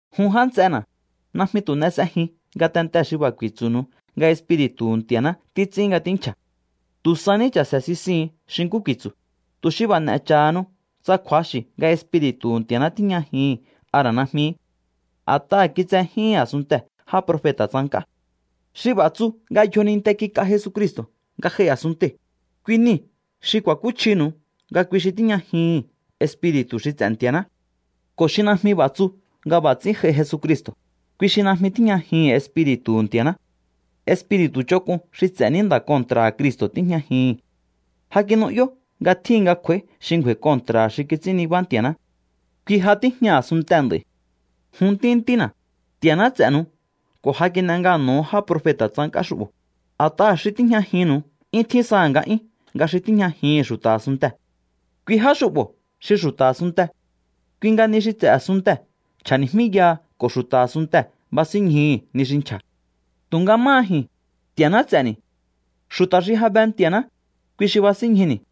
Jun já nts'ena̱, najmi tu̱ n'e s'ejiun ngatentee̱ xi b'a̱ ku̱i̱tsu̱nu̱u nga Espiri̱tu̱hu̱ Nti̱a̱ná títs'ín nga tínchja̱. Tu̱ sa ní cha̱se̱ sisihu̱un xi nkú ku̱i̱tsu̱, tu̱ xi b'a̱ n'e̱ cha̱hanu tsa kju̱axi̱ nga Espiri̱tu̱hu̱ Nti̱a̱ná tíjñajihi̱n a ra̱ najmi. A̱t'aha̱ kitsejíhin a̱sunntee̱ já profeta̱ tsank'á. Xi b'a̱ tsu nga yjoninte kik'a Jesucristo̱ nga j'ai a̱sunntei̱, kui niu̱ xi ku̱a̱kúchjinu̱u nga kui xi tíjñajihi̱n Espiri̱tu̱ xi ts'e̱ Nti̱a̱ná. Ko̱ xi najmi b'a̱ tsu nga b'a̱ ts'ín j'ai Jesucristo̱, kui xi najmi tíjñajihi̱n Espiri̱tu̱hu̱ Nti̱a̱ná. Espiri̱tu̱ ch'onk'un xi ts'e̱ ní nda̱ kontra̱ha̱ Cristo̱ tíjñajihi̱n. Ja kinu'yó nga tjíhin nga kj'u̱a̱í xi ngju̱a̱i̱ kontra̱ha̱ xi kits'ín nibá Nti̱a̱ná. Kui ja tíjña a̱sunntee̱ nd'a̱i̱. Jun ntíntíntína̱, Nti̱a̱ná ts'e̱nu̱u ko̱ ja kin'e ngano̱ho̱o já profeta̱ tsank'á xu'bo̱, a̱t'aha̱ xi tíjñajinnu̱u 'yún tjín saha̱ nga'yún nga xi tíjñajihi̱n xu̱ta̱ a̱sunntee̱. Kui já xu'bo̱ xi xu̱ta̱ a̱sunnte. Kui nga ni xi ts'e̱ a̱sunntee̱ nchja̱ni̱jmíyaha ko̱ xu̱ta̱ a̱sunntee̱ basínñjuhu̱ ni xi nchja̱. Tu̱nga máha ji̱n, Nti̱a̱ná ts'e̱ni̱. Xu̱ta̱ xi ja be Nti̱a̱ná, kui xi basínñjuni̱.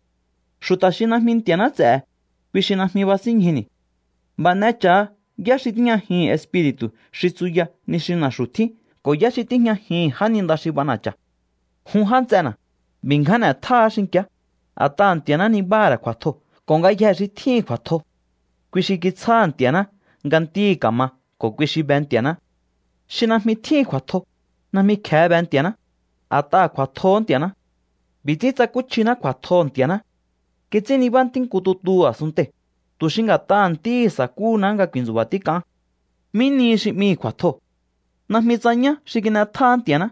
Xu̱ta̱ xi najmi Nti̱a̱ná ts'e̱he̱, kui xi najmi basínñjuni̱. B'a̱ n'e cha̱ha yá xi tíjñajihi̱n Espiri̱tu̱ xi tsuya ni xi na̱xu̱ tjín ko̱ yá xi tíjñajihi̱n jáninda xi b'ana̱cha̱. Jun já nts'ena̱, b'i̱ ngján n'e̱tjáá xinki̱á, a̱t'aha̱ Nti̱a̱ná nibáha̱ ra̱ kju̱a̱tjoo̱ ko̱ ngayjee̱ xi tjíhi̱n kju̱a̱tjo, kui xi kitsjáha̱ Nti̱a̱ná nga ntíhi̱ ka̱ma ko̱ kui xi be Nti̱a̱ná. Xi najmi tjíhi̱n kju̱a̱tjo, najmi kje̱e be Nti̱a̱ná, a̱t'aha̱ kju̱a̱tjohó Nti̱a̱ná. B'i̱ ts'ín tsakúchjiná kju̱a̱tjoho̱ Nti̱a̱ná. Kits'ín nibá Ntí nku tutuhu̱ a̱sunntei̱, tu̱ xi nga̱t'aha̱ Ntíhi̱ sa̱kúhuná nga ku̱i̱ntsu̱ba̱ tík'aán. ¿Mí nihi xi 'mihi̱ kju̱a̱tjoo̱? Najmi tsa ñá xi kin'etjáá Nti̱a̱ná.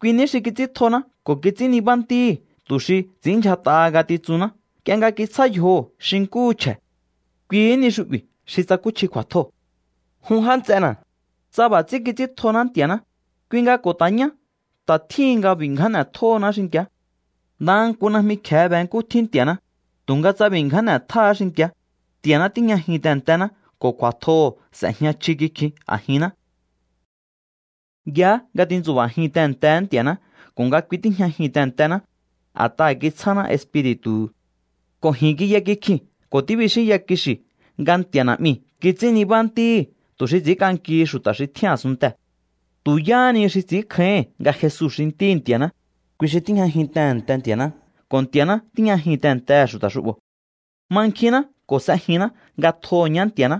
Kui ní xi kits'íntjoná ko̱ kits'ín nibá Ntíhi̱ tu̱ xi ts'i̱ínndyjat'aha ngatitsunná nk'ie nga kitsjá yjoho̱ xi nkúhu chje̱. Kuihí ni xu'bi̱ xi tsakúchji kju̱a̱tjoo̱. Jun já nts'ena̱, tsa b'a̱ ts'ín kits'íntjoná Nti̱a̱ná, kui nga ko̱ ta̱ ñá ta̱ tjíhin nga b'i̱ ngján n'e̱tjohoná xinki̱á. Ndaha nku najmi kje̱e be nkú tjín Nti̱a̱ná, tu̱nga tsa b'i̱ ngján n'etjáá xinki̱á, Nti̱a̱ná tíjñajin tehe̱ntená ko̱ kju̱a̱tjoho̱ s'ejña chji kikjin a̱jinná. Yaá nga tintsu̱ba̱jin tehe̱ntehe̱é Nti̱a̱ná ko̱ nga kui tíjñajin tehe̱ntená, a̱t'aha̱ kitsjáná Espiri̱tu̱hu̱. Ko̱ ji̱n kiya kikjii̱n ko̱ tíbixínyakixi̱ nga Nti̱a̱ Na̱'miu̱ kits'ín nibá Ntíhi̱ tu̱ xi ts'i̱ínk'ankihi xu̱ta̱ xi tjín a̱sunntee̱. Tu̱ yáhá ni xi ts'i̱ínkjáíhi̱n nga Jesu xi Ntíhi̱ Nti̱a̱ná, kui xi tíjñajin tehe̱nte Nti̱a̱ná ko̱ Nti̱a̱ná tíjñajin tehe̱ntehe̱ xu̱ta̱ xu'bo̱. Mankjinná ko̱ s'ejinná nga tjoho̱ ñá Nti̱a̱ná.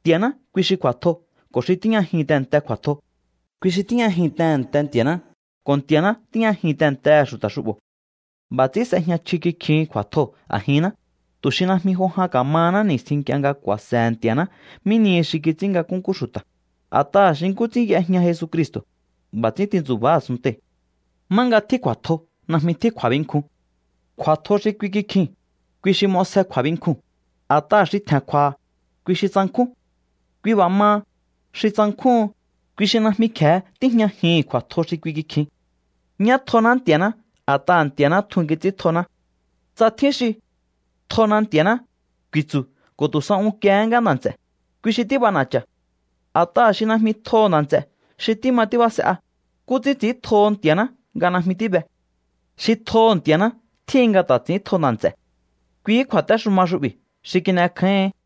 Nti̱a̱ná kui xi kju̱a̱tjo, ko̱ xi tíjñajin tehe̱nte kju̱a̱tjoo̱, kui xi tíjñajin tehe̱nte Nti̱a̱ná ko̱ Nti̱a̱ná tíjñajin tehe̱ntehe̱ xu̱ta̱ xu'bo̱. B'a̱ ts'ín s'ejña chji kikjihin kju̱a̱tjoo̱ a̱jinná, tu̱ xi najmi jo jan ka̱mahaná ni̱stjín nk'ie nga ku̱a̱se̱he̱ Nti̱a̱ná mí nihi xi kits'ín nga nkúnkú xu̱ta̱. A̱t'aha̱ xi nkú ts'ín y'ejña Jesucristo̱, b'a̱ ts'ín tintsu̱ba̱á a̱sunntei̱. Má nga tjín kju̱a̱tjo najmi tjín kju̱a̱binkjun. Kju̱a̱tjo xi kui kikjiu̱n, kui xi m'osje kju̱a̱binkjuu̱n, a̱t'aha̱ xi tje̱n kju̱a̱ha̱, kui xi tsankjún. Kui b'a̱ maha, xi tsankjúhun, kui xi najmi kje̱e tíjñajihi̱n kju̱a̱tjo xi kui kikjin. Ñá tjoná Nti̱a̱ná a̱t'aha̱ Nti̱a̱ná tjun kits'íntjoná. Tsa tjín xi: “Tjona Nti̱a̱ná”, ku̱i̱tsu̱ ko̱ tu̱ sa unkiehé ngá nda̱ nts'e̱, kui xi tíb'ana̱cha̱. A̱t'aha̱ xi najmi tjoho̱ nda̱ nts'e̱ xi tíma tíbase'a, ¿nkú ts'ín ts'i̱íntjoho Nti̱a̱ná nga najmi tíbe? Xi tjoho̱ Nti̱a̱ná tjíhin nga ta̱ ts'i̱íntjo nda̱ nts'e̱. Kuihí kju̱a̱téxuma xu'bi̱ xi kin'ekjái̱ín.